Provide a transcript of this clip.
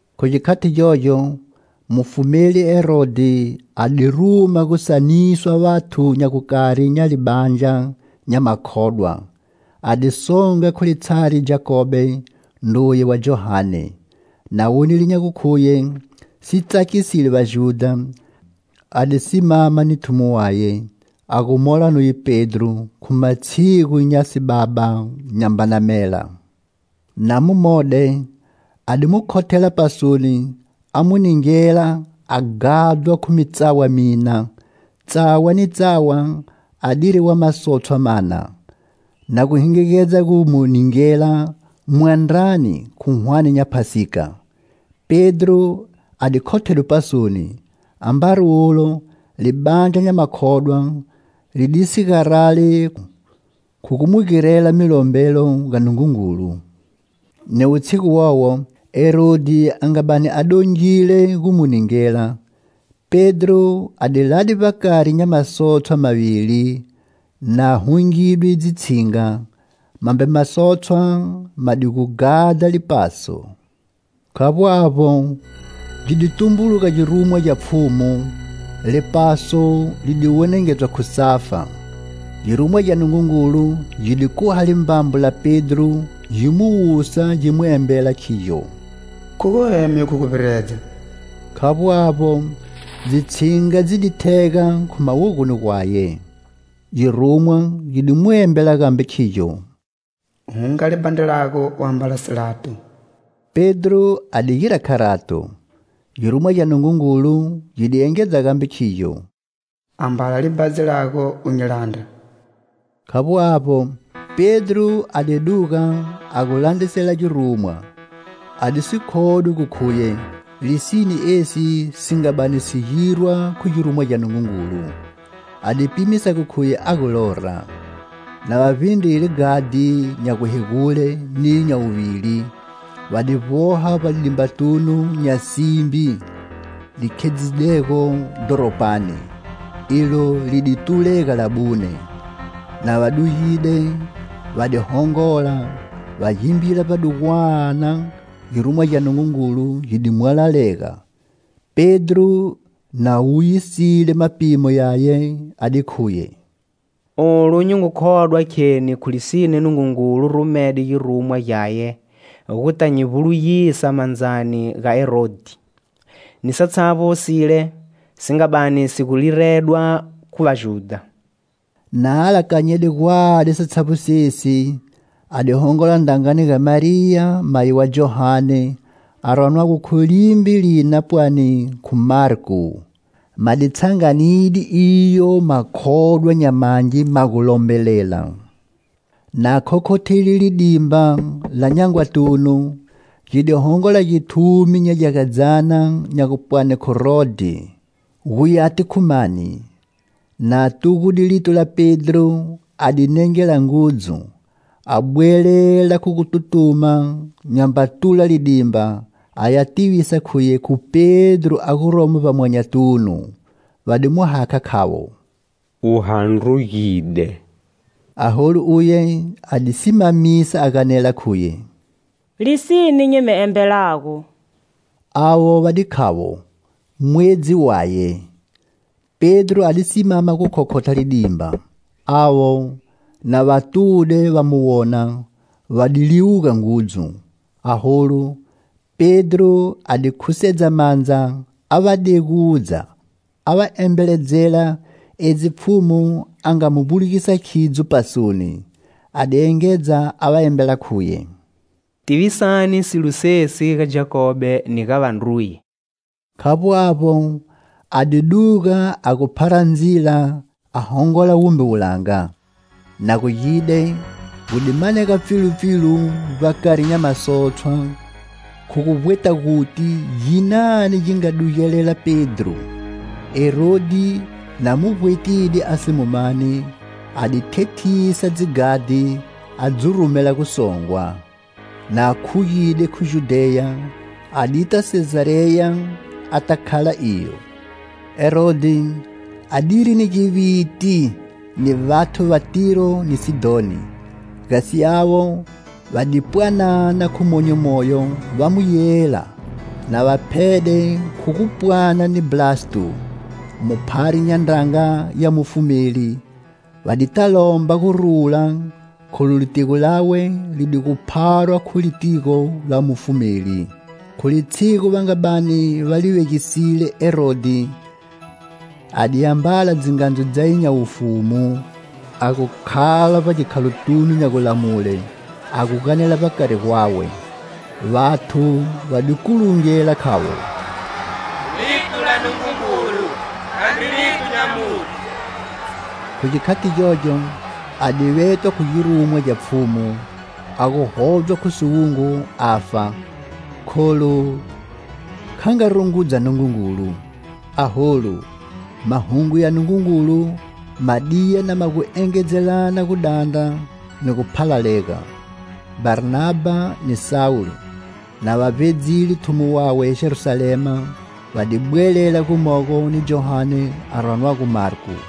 Khu gikhati gyogyo, mufumeli Herodhi a di ruma gu saniswa vathu nya gukari nya libandla nya makhodwa, a di songa khu litshari Jakobe, ndruye wa Johane. Na wonile nya gukhuye si tsakisile Vajudha, a di simama ni thumo waye, a gu mola nuye Pedro, khu matshigu nya sibaba nyambana mela. Na mu mode, a di mu khothela pasoni a mu ningela a ghadhwa khu mitsawa mina, tsawa ni tsawa a diri wa masotshwa mana. Na gu hingigedza gu mu ningela mwandrani khu hwane nya Phasika. Pedro a di khothedwe pasoni, ambari ulo libandla nya makhodwa li di si garali khu gu mu girela milombelo ga Nungungulu. Ni wutshigu wowo Herodhi a nga bani a dongile gu mu ningela, Pedro a di lade vbakari nya masotshwa mavili na hungidwe dzitshinga, mambe masotshwa ma di gu ghadha lipaso. Khavbo avbo, gi di tumbuluga girumwa gya Pfhumu, lipaso li di wenengedzwa khu safa; girumwa gya Nungungulu gi di khuha limbambo la Pedro, gi mu wusa gi mu embela khigyo: "Khuga u eme khu guvbiredza." Khavbo avbo, dzitshinga dzi di thega khu mawogoni gwaye. Girumwa gi di mu embela gambe khigyo: "Hunga libhandri lago u ambala silato." Pedro a di gira kharato. Girumwa gya Nungungulu gi di engedza gambe khigyo: "Ambala libhadzi lago u nyi landra." Khavbo avbo, Pedro a di duga a gu landrisela girumwa. A di si khodwi gu khuye lisine esi si nga bani si girwa khu girumwa gya Nungungulu: a di pimisa gu khuye a gu lora. Na va vbindrile ghadhi nya guhegule niyo nya wuvili, va di vboha vbalidimbatunu nya simbi li khedzidego dhoropani, ilo li di tulega labune. Na va dugide, va di hongola, va gimbila vbadugwana, girumwa gya Nungungulu gi mwalalega. Pedro na wuyisile mapimo yaye, a di khuye: "Olu nyi ngu khodwa kheni khu lisine, Nungungulu rumede girumwa gyaye gu ta nyi vbulugisa mandzani ga Herodhi ni satshavbo sile si nga bani si gu liredwa khu Vajudha." Na alakanyede gwadi satshavbo sesi, a di hongola ndrangani ga Mariya mayi wa Johane a ranwago khu limbe lina pwani khu Marko. Ma di tshanganide iyo makhodwa nya mangi ma gu lombelela. Na khokhothile lidimba la nyangwatunu, gi di hongola githumi nya gyagadzyana nya gupwani khu Rodhe, gu yati khu mani. Na tugude lito la Pedro a di nengela ngudzu, a bwelela khu gututuma nyamba tula lidimba, a ya tivisa khuye khu Pedro a guromo vbamwanyatunu. Va di mu hakha khavo "U handrugide." Aholu uye a di simamisa a ganela khuye: "Lisine nyi mi embelago." Avo va di khavo: "Mwedzi waye!" Pedro a di simama gu khokhotha lidimba. Avo, na va tude va mu wona, va di liwuga ngudzu. Aholu, Pedro a di khusedza mandza a va degudza a va embeledzela edzi Pfhumu a nga mu vbulugisa idzo pasoni. A di engedza a va embela khuye: "Tivisani silo sesi ga Jakobe ni ga vandruye." Khavbo avbo a di duga a gu phara ndzila a hongola wumbe wulanga. Na gu gide, gu di manega pfilupfilu vbakari nya masotshwa, khu guvbweta guti ginani gi nga dugelela Pedro. Herodhi, na mu vbwetide a si mu mani, a di thethisa dzighadhi, a dzi rumela gusongwa. Na khugide khu Judheya, a di ta Sezareya, a ta khala iyo. Herodhi a diri ni giviti ni vathu va Tiro ni Sidhoni. Gasi avo va di pwanana khu monyo moyo va mu yela, na va phede khu gu pwana ni Blasto, muphari nya ndranga ya mufumeli, va di ta lomba gurula kholu litigo lawe li di gu pharwa khu litigo la mufumeli. Khu litshigu va nga bani va li vegisile Herodhi a di ambala dzingandzu dzaye nya wufumu a gu khala vbagikhalotunu nya gulamule, a gu ganela vbakari gwawe. Vathu va di kulungela khavo: "Lito la Nungungulu, khandri lito nya muthu." Khu gikhati gyogyo a di vetwa khu girumwa gya Pfhumu, a gu hodzwa khu siwungu afa, kholu kha nga rungudza Nungungulu. Aholu, mahungu ya Nungungulu ma diya na ma gu engedzelana gudandra, ni guphalalega. Bharnabha ni Sawulo, na va vbedzile thumo wawe Jerusalema va di bwelela gumogo ni Johane a ranwago Marko.